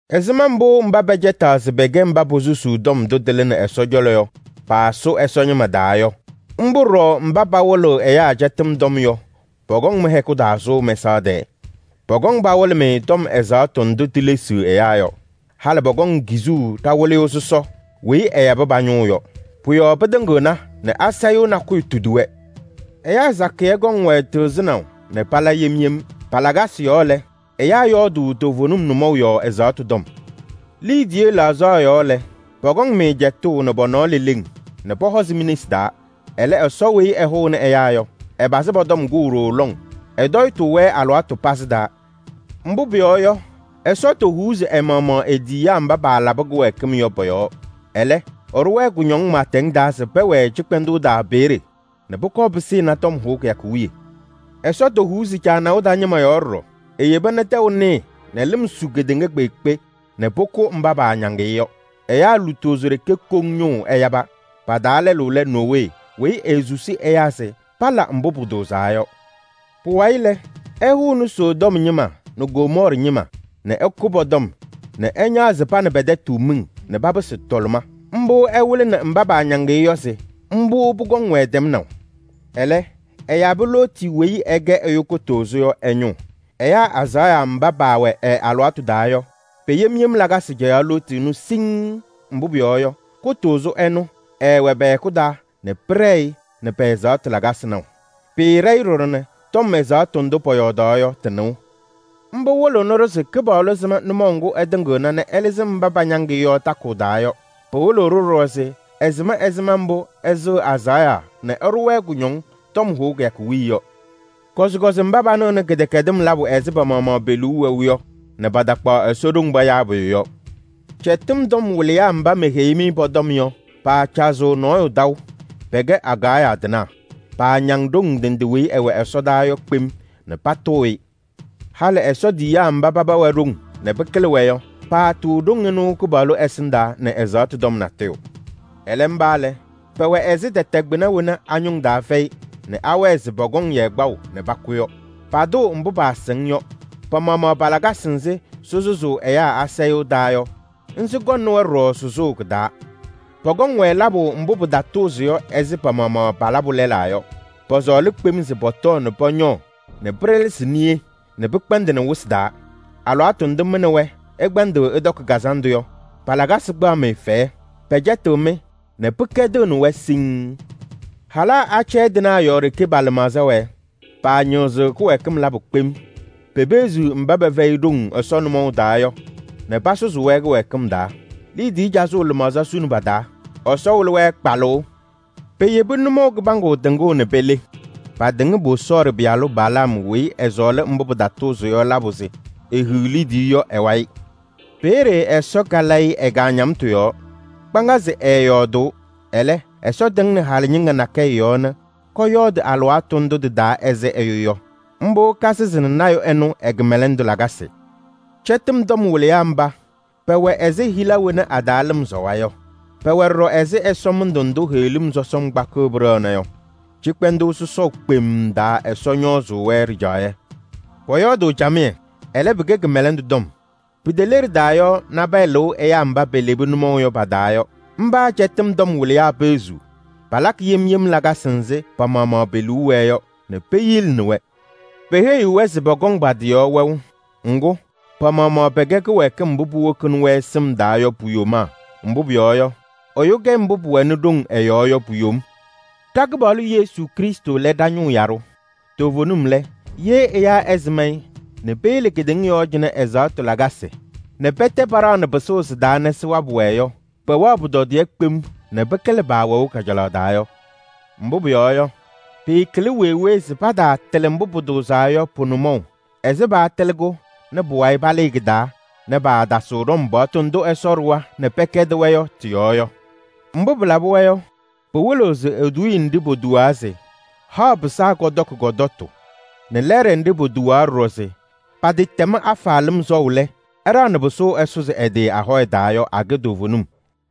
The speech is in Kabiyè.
Ɛzɩma mbʋ mba pɛcɛtaɣ se pɛkɛ mba posusuu tɔm ndʋ tɩlɩnɩ Ɛsɔ cɔlɔ yɔ paasʋ Ɛsɔ ñɩma taa yɔ, mbʋ ɖɔɖɔ mba pawɩlɩɣ ɛyaa cɛtɩm tɔm yɔ pɔkɔŋ mɩ-hɛkʋ taa sʋʋ mɛsaɣ tɛɛ. Pɔkɔŋ pawɩlɩ-mɩ tɔm ɛzaɣtʋ ndʋ tilesiɣ ɛyaa yɔ. Halɩ pɔkɔŋ kizuu ɖa-Wɩlɩyʋ sɔsɔ weyi ɛyabɩ pa-ñʋʋ yɔ. Pʋ-yɔɔ pɩtɩŋɩɣna nɛ asayʋʋ nakʋyʋ tudi-wɛ. Ɛyaa sakɩyɛ kɔŋ-wɛ tɩɣzɩnaʋ nɛ pala yem yem. Pa-lakasɩ yɔɔ lɛ, ɛyaa yɔɔdʋʋ toovenim nʋmɔʋ yɔɔ ɛzaɣtʋ tɔm. Liidiye laɣzaɣ yɔɔ lɛ, pɔkɔŋ-mɩ cɛtʋʋ nɛ pɔ-nɔɔ leleŋ nɛ pɔhɔɔzɩ mi-nesi taa. Ɛlɛ, Ɛsɔ weyi ɛhʋʋnɩ ɛyaa yɔ, ɛpazɩ pɔ-tɔm kʋʋ ɖooo lɔŋ. Ɛtɔyɩtʋʋ-wɛ alɩwaatʋ pazɩ taa. Mbʋ pʋyɔɔ yɔ, Ɛsɔ tɛfɛɛ ɛ-maɣmaɣ e-tiyiyaa mba paalabɩ kɩwɛɛkɩm yɔ. Ɛlɛ, ɛɖʋ-wɛ kʋñɔŋ pɩɩtɛŋ taa se pɛwɛɛ cɩkpɛndʋʋ taa peeye nɛ pʋkɔɔ pɩsɩnɩ tɔm hʋʋ kɩyakʋ wiye. Ɛsɔ tɛfɛɛ caanaʋ taa ñɩma ɖɔɖɔ: eyeba nɛ tɛʋ nɩɩ nɛ lɩm su kedeŋa kpeekpe nɛ pʋkʋ mba paañaŋ-ɩ yɔ. Ɛyaa lutozo ɖeke koŋ ñʋʋ ɛyaba. Pa-taa lɛlʋ lɛ Nowee weyi eesusi ɛyaa se pala mbʋ pʋtʋʋzaa yɔ. Pʋwayɩ lɛ, ɛhʋnɩ Sodom ñɩma nɛ Gomɔɔrɩ ñɩma nɛ ɛkʋ pɔ-tɔm nɛ ɛñaɣzɩ pa nɛ pɛ-tɛtʋ miŋ nɛ papɩsɩ tɔlɩma. Mbʋ ɛwɩlɩnɩ mba paañaŋ-ɩ yɔ se mbʋ pʋkɔŋ-wɛ tɛmnaʋ. Ɛlɛ, ɛyabɩ Looti weyi ɛkɛ ɛyʋ kʋtʋʋzʋ yɔ ɛ-ñʋʋ. Ɛyaa azaɣa mba paawɛ ɛ-alɩwaatʋ taa yɔ, pe-yem yem lakasɩ cɛyaɣ Looti ɛnʋ siŋŋ. Mbʋ pʋyɔɔ yɔ, kʋtʋʋzʋ ɛnʋ, ɛɛwɛ pɛ-hɛkʋ taa nɛ pɩɖɛɛ-ɩ nɛ pɛ-ɛzaɣtʋ lakasɩ naʋ. Pɩɩɖɛ-ɩ ɖɔɖɔ nɛ tɔm ɛzaɣtʋ ndʋ pɔyɔɔdaɣ yɔ tɩ-nɩʋ. Mbʋ wɩlɩɣnɩ-ɖʋ se Kɩpaɣlʋ sɩm nʋmɔʋ ŋgʋ ɛtɩŋɩɣna nɛ ɛlɩzɩ mba pañaŋ-ɩ yɔ takʋʋ taa yɔ. Pɩwɩlɩɣ-ɖʋ ɖɔɖɔ se ɛsɩm ɛzɩma mbʋ ɛsɩɣ azaɣa nɛ ɛɖʋ-wɛ kʋñɔŋ tɔm hʋʋ kɩyakʋ wiye yɔ. Kɔzɩkɔzɩ mba panɩɣnɩ kɩdɛkɛdɩm labʋ ɛzɩ pa-maɣmaɣ pe-liu wɛʋ yɔ nɛ patakpaɣ Ɛsɔ ɖoŋ payaa pʋyʋ yɔ. Cɛtɩm tɔm wɩlɩyaa mba meheyi-mɩ pɔ-tɔm yɔ, paacazɩɣ nɔɔyʋ taʋ, pɛkɛ agaɣya tɩnaa. Paañaŋ ɖoŋ ndɩ ndɩ weyi ɩwɛ ɛsɔdaa yɔ kpem nɛ patʋʋ-ɩ. Halɩ Ɛsɔ tiyiyaa mba paba wɛ ɖoŋ nɛ pɩkɩlɩ-wɛ yɔ, paatʋʋ ɖoŋ ɩnʋ Kɩpaɣlʋ ɛsɩndaa nɛ ɛzaɣtʋ tɔm natʋyʋ. Ɛlɛ, mba lɛ, pɛwɛ ɛzɩ tɛtɛ kpɩna wena a-ñʋŋ taa fɛyɩ nɛ awɛɛ se pɔkɔŋ-yɛ kpaʋ nɛ pakʋ yɔ. Patʋʋ mbʋ paasɩŋ yɔ. Pa-maɣmaɣ pa-lakasɩ nzɩ sɩsʋzʋʋ ɛyaa asayʋʋ taa yɔ, sɩkɔŋnɩ-wɛ ɖɔɖɔ sʋzʋʋ kɩ-taa. Pɔkɔŋ-wɛ labʋ mbʋ pɩtatʋʋzɩ yɔ ɛzɩ pa-maɣmaɣ palabʋ lɛlaa yɔ. Pɔsɔɔlɩ kpem se pɔtɔɔ nɛ pɔñɔɔ nɛ pɩɖɛlɛsɩ niye nɛ pɩkpɛndɩnɩ wɩsɩ taa. Alɩwaatʋ ndʋ mɩ nɛ wɛ ɩkpɛndɩɣ ɩtɔkɩ kazandʋ yɔ, pa-lakasɩ kpaɣ-mɩ fɛyɛ. Pɛcɛtɩɣ-mɩ nɛ pɩkɛdɩɣnɩ-wɛ siŋŋ. Halaa acɛyɛ tɩnaa yɔɔ ɖeke pa-lɩmaɣza wɛɛ. Paañɩɣzɩɣ kɩwɛɛkɩm labʋ kpem. Pepeɣziɣ mba pɛfɛyɩ ɖoŋ Ɛsɔ nʋmɔʋ taa yɔ nɛ pasʋzʋʋ-wɛ kɩwɛɛkɩm taa. Liidiye cazʋʋ lɩmaɣza suni pa-taa. Ɛsɔ wɩlɩ-wɛ kpalʋʋ. Peyebi nʋmɔʋ kɩbaŋgʋ tɩŋʋʋ nɛ pele. Patɩŋ Bosɔɔrɩ pɩyalʋ Balaam weyi ɛɛsɔɔlɩ mbʋ pɩtatʋʋzɩ yɔ labʋ se ehiɣ liidiye yɔ ɛ-wayɩ. Peeye Ɛsɔ kalɩ-ɩ ɛ-kaañamtʋ yɔɔ. Kpaŋazɩ ɛɛyɔɔdʋʋ. Ɛlɛ, Ɛsɔ tɩŋnɩ halɩ ñɩŋga nakɛyɛ yɔɔ nɛ kɔyɔɔdɩ alɩwaatʋ ndʋ tɩ-taa ɛzɩ ɛyʋ yɔ. Mbʋ kasɩzɩnɩ lɔɔyaɣ tʋ ɛnʋ ɛ-kɩmɛlɛndʋ lakasɩ. Cɛtɩm tɔm wɩlɩyaa mba, pɛwɛ ɛzɩ hila wena a-taa lɩm sɔwa yɔ. Pɛwɛ ɖɔɖɔ ɛzɩ ɛsɔmɩndʋ ndʋ heɣlim sɔsɔm kpakɩɣ pɩɖɛɣna yɔ. Cɩkpɛndʋʋ sɔsɔʋ kpemm taa Ɛsɔ ñɔɔzʋʋ-wɛ ɖɩjaɣyɛ. Pɔyɔɔdʋʋ camɩyɛ, ɛlɛ pɩkɛ kɩmɛlɛndʋ tɔm. Piteleɖida yɔ, nabɛyɛ lɩʋ ɛyaa mba pelebi nʋmɔʋ yɔ pa-taa yɔ. Mba cɛtɩm tɔm wɩlɩyaa peɣziɣ. Palakɩ yem yem lakasɩ nzɩ pa-maɣmaɣ pe-liu wɛɛ yɔ nɛ peyilini-wɛ. Peheyiɣ-wɛ se pɔkɔŋ pa-tɩ yɔɔ wɛʋ. Ŋgʋ, pa-maɣmaɣ pɛkɛ kɩwɛɛkɩm mbʋ puwokini-wɛ sɩm taa yɔ pu-yomaa. Mbʋ pʋyɔɔ yɔ, ɛyʋ kɛ mbʋ pʋwɛnɩ ɖoŋ ɛ-yɔɔ yɔ pu-yom. Ɖa-Kɩpaɣlʋ Yesu Krɩstʋ lɛ ɖa-ñʋʋ yaɖʋ. Toovenim lɛ, ye ɛyaa ɛsɩm-ɩ nɛ peyele kedeŋa yɔɔ cɩnɛ ɛzaɣtʋ lakasɩ nɛ pɛtɛ paɖaɣnɩ pɩsʋʋ sɩ-taa nɛ sɩwabɩ-wɛ yɔ, pɛwɛɣ pʋtɔdɩyɛ kpem nɛ pɩkɩlɩ paawɛʋ kajalaɣ taa yɔ. Mbʋ pʋyɔɔ yɔ, pɩɩkɩlɩ wee wee se pataatɩlɩ mbʋ pʋtʋʋzaa yɔ pʋ-nʋmɔʋ ɛzɩ paatɩlɩ-kʋ nɛ pʋwayɩ palɩɩ kɩ-taa nɛ paatasɩɣ ɖɔm paɣtʋ ndʋ Ɛsɔ ɖʋwa nɛ pɛkɛdɩ-wɛ yɔ tɩ-yɔɔ yɔ. Mbʋ pɩlabɩ-wɛ yɔ, pɩwɩlɩɣ se eduuye nɖɩ potuwaa se: “Haɣ pɩsaa kɔtɔkɩ kɔ-tɔtʋ” nɛ lɛɛɖɛ nɖɩ potuwaa ɖɔɖɔ se: “Patɩtɛm afa lɩm sɔʋ lɛ, ɛɖaɣnɩ pɩsʋʋ ɛsʋzɩ ɛ-tɩ ahɔya taa” yɔ, akɛ toovenim.